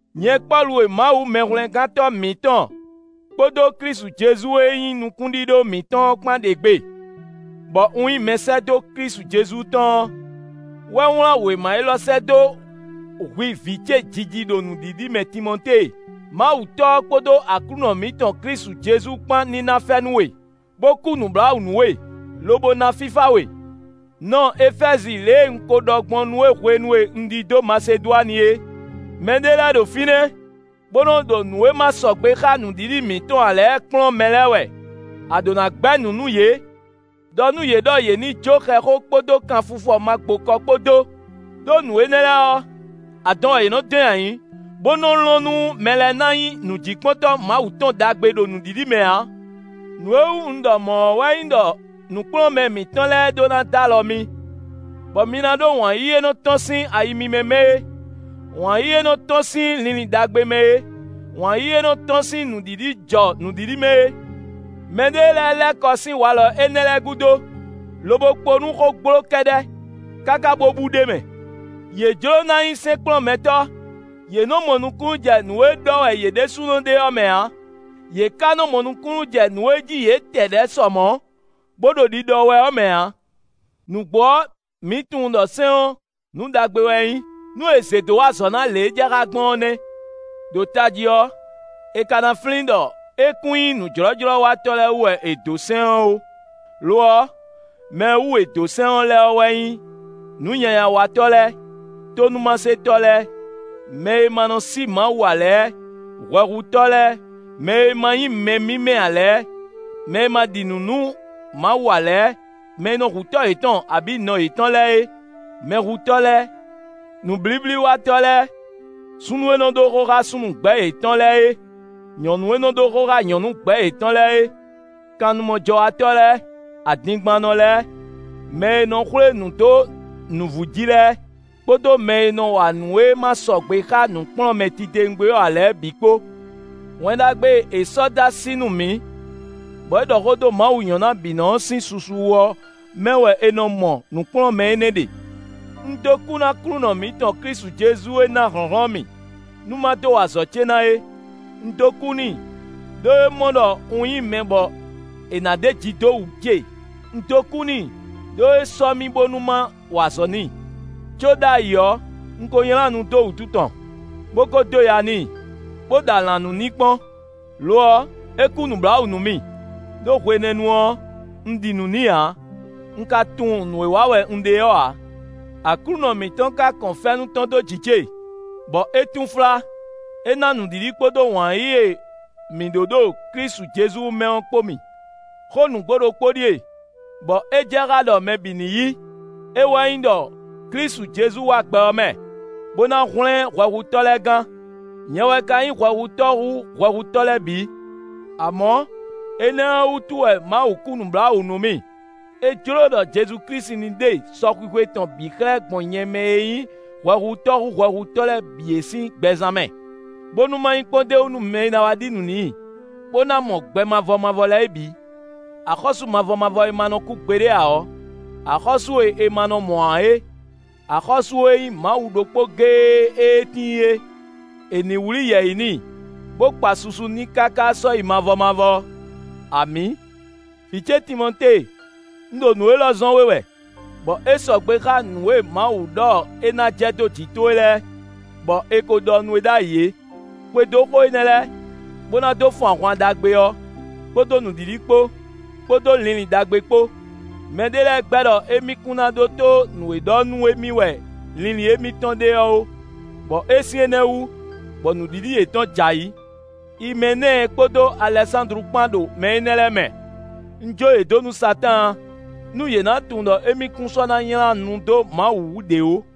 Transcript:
Nyɛ Pɔ́lu e Mawu Mɛhwlɛ́ngántɔ́ mǐtɔn, kpódó Klísu Jezu e nyí nukúnɖíɖó mǐtɔn ɔ́ kpán ɖe gbe, bɔ un nyí mɛsɛ́dó Klísu Jezu tɔn ɔ́ wɛ wlán wěma élɔ́ sɛ́ dó hwi vǐ ce jiji ɖo nǔɖiɖi mɛ Timɔtée. Mawu Tɔ́ ɔ́ kpódó Aklúnɔ mǐtɔn Klísu Jezu kpán ní ná fɛ́nú we, bó kú nǔbláwǔ nú we, lobo ná fífá we. Nɔ Efɛ́zi lě e un ko ɖɔ gbɔn nú we hwenu e un ɖidó Masedwani é; mɛɖé lɛ́ɛ ɖo fínɛ́, bó nɔ ɖo nǔ e ma sɔgbe xá nǔɖiɖi mǐtɔn ǎ lɛ́ɛ kplɔ́n mɛ lɛ́ɛ wɛ; a ɖǒ ná gbɛ́ nǔ nú yě. Đɔ nú yě ɖɔ yě ní jó xɛxó kpódó kanfifɔ magbokɔ kpó dó, ɖó nǔ énɛ́ lɛ́ɛ ɔ́, adɔn wɛ yě nɔ dɔn nyi ayǐ, bó nɔ́ lɔn nú mɛ lɛ́ɛ ná nyí nǔjíkpɔ́ntɔ́ Mawu tɔn ɖagbe ɖo nǔɖiɖi mɛ ǎ. Nǔ e wú un ɖɔ mɔ̌ ɔ́ wɛ nyí ɖɔ nǔkplɔ́nmɛ mǐtɔn lɛ́ɛ ɖó ná d'alɔ mi, bɔ mi ná ɖó wǎn yíyí e nɔ tɔ́n sín ayi mímɛ́ mɛ é; wǎn yíyí e nɔ tɔ́n sín linlin ɖagbe mɛ é, wǎn yíyí e nɔ tɔ́n sín nǔɖiɖi jɔ nǔɖiɖi mɛ é. Mɛ ɖé lɛ́ɛ lɛ́ kɔ sín walɔ énɛ́ lɛ́ɛ gúdo, lobo kpo nú xógbló kɛ́ɖɛ́, káká bó bú ɖ'é mɛ. Yě jló ná nyí sɛ́nkplɔ́nmɛtɔ́, yě nɔ mɔ nukúnnú jɛ nǔ e ɖɔ wɛ yě ɖésúnɔ ɖe ɔ́ mɛ ǎ; yě ka nɔ mɔ nukúnnú jɛ nǔ e jí yě tɛ ɖɛ̌ sɔ mɔ̌, bó ɖo ɖiɖɔ wɛ ɔ́ mɛ ǎ. Nǔgbó ɔ́, mǐ tunwun ɖɔ sɛ́n ɔ́, nǔ ɖagbe wɛ é nyí, nú è zě dó wa azɔ̌ ná lě e é jɛ xá gbɔn ɔ́ nɛ́. Đo tají ɔ́, è ka ná flín ɖɔ é kún nyí nǔjlɔ́jlɔ́watɔ́ lɛ́ɛ wú wɛ è dǒ sɛ́n ɔ́ ó; lo ɔ́, mɛ e wú è dǒ sɛ́n ɔ́ lɛ́ɛ wɛ nyí nǔnyanyawatɔ́ lɛ́ɛ, tónúmasetɔ́ lɛ́ɛ, mɛ e ma nɔ sí Mawu ǎ lɛ́ɛ, hwɛhutɔ́ lɛ́ɛ, mɛ e ma nyí mɛ mímɛ́ ǎ lɛ́ɛ, mɛ e ma ɖi nǔ nú Mawu ǎ lɛ́ɛ, mɛ e nɔ hu tɔ́ yětɔn abǐ nɔ yětɔn lɛ́ɛ é, mɛhutɔ́ lɛ́ɛ. Nǔblíblíwatɔ́ lɛ́ɛ, súnnu e nɔ ɖó xó xá súnnu gbɛ̌ yětɔn lɛ́ɛ é, nyɔ̌nu e nɔ ɖó xó xá nyɔ̌nu gbɛ̌ yětɔn lɛ́ɛ é, kannumɔjɔ́watɔ́ lɛ́ɛ, adingbannɔ lɛ́ɛ, mɛ e nɔ xwlé nǔ dó nǔvú jí lɛ́ɛ, kpódó mɛ e nɔ wa nǔ e ma sɔgbe xá nǔkplɔ́nmɛ titewungbe ɔ́ ǎ lɛ́ɛ bǐ kpó. Wɛn Ɖagbe e è sɔ́ dó así nú mǐ, bɔ é ɖɔ xó dó Mawu nyɔ̌nábǐnɔ ɔ́ sín susu wú ɔ́ mɛ wɛ è nɔ mɔ nǔkplɔ́nmɛ énɛ́ ɖe. Un dó kú nú Aklúnɔ mǐtɔn Klísu Jezu e ná hlɔ̌nhlɔ́n mì, nú ma dó wa azɔ̌ ce ná é. Un dó kú n'i, ɖó é mɔ ɖɔ un nyí mɛ bɔ è nǎ ɖeji dó wǔ ce, un dó kú n'i, ɖó é sɔ́ mì bónú ma wa azɔ̌ n'i. Có ɖ'ayǐ ɔ́, un ko nylá nu dó wǔtu tɔn, bó kó dó ya n'i, bó ɖɔ alǎnnú n'i kpɔ́n. Lo ɔ́, é kú nǔbláwǔ nú mì, ɖó hwenɛ́nu ɔ́, un ɖi nǔ n'i ǎ, un ka tunwun nǔ e wa wɛ un ɖe ɔ́ ǎ. Aklúnɔ mǐtɔn ka kɔn fɛ́nú tɔn dó jǐ ce, bɔ é túnflá; é ná nǔɖiɖi kpódó wǎn yíyí e mǐ ɖǒ ɖo Klísu Jezu mɛ ɔ́ kpó mì. Xó nǔgbó ɖokpó ɖíe, bɔ é jɛ xá ɖɔ mɛ bǐ ní yí; é wɛ nyí ɖɔ Klísu Jezu wá gbɛ ɔ́ mɛ, bó ná hwlɛ́n hwɛhutɔ́ lɛ́ɛ gán; nyɛ wɛ ka nyí hwɛhutɔ́ hú hwɛhutɔ́ lɛ́ɛ bǐ. Amɔ̌ énɛ́ ɔ́ wútu wɛ Mawu kú nǔbláwǔ nú mì; é jló ɖɔ Jezu Klísu ní ɖe sɔxwixwe tɔn bǐ xlɛ́ gbɔn nyɛ mɛ e nyí hwɛhutɔ́ hú hwɛhutɔ́ lɛ́ɛ bǐ é sín gbɛzán mɛ, bónú ma nyí kpɔ́n d'é wú nú mɛ e ná wá ɖi nǔ n'i, bó ná mɔ gbɛ mavɔ mavɔ lɛ́ɛ é bǐ. Axɔ́sú mavɔ mavɔ e ma nɔ kú gbeɖé ǎ ɔ́, axɔ́sú e è ma nɔ mɔ ǎ é, axɔ́sú e nyí Mawu ɖokpó géé ée tíin é; è nǐ wlí yɛ̌yi n'i, bó kpa susu n'i káká sɔ́yi mavɔ mavɔ. Amǐ. Vǐ ce Timɔtée, un ɖo nǔ élɔ́ zɔ́n we wɛ, bɔ é sɔgbe xá nǔ e Mawu ɖɔ é ná jɛ dó jǐ towe lɛ́ɛ, bɔ è ko ɖɔ nú we ɖ'ayǐ é. Xwedó xó énɛ́ lɛ́ɛ, bó ná dó fun ahwan ɖagbe ɔ́, kpódó nǔɖiɖi kpó, kpódó linlin ɖagbe kpó. Mɛ ɖé lɛ́ɛ gbɛ́ ɖɔ émí kún ná ɖótó nǔ e ɖɔ nú émí wɛ linlin émítɔn ɖe ɔ́ ó, bɔ é sín énɛ́ wú, bɔ nǔɖiɖi yětɔn jɛ ayǐ. Imɛnɛ́ɛ kpódó Alɛsándlu kpán ɖo mɛ énɛ́ lɛ́ɛ mɛ. Un jó yě dó nú Satáan, nú yě ná tunwun ɖɔ émí kún sɔ́ ná nylá nu dó Mawu wú ɖě ó.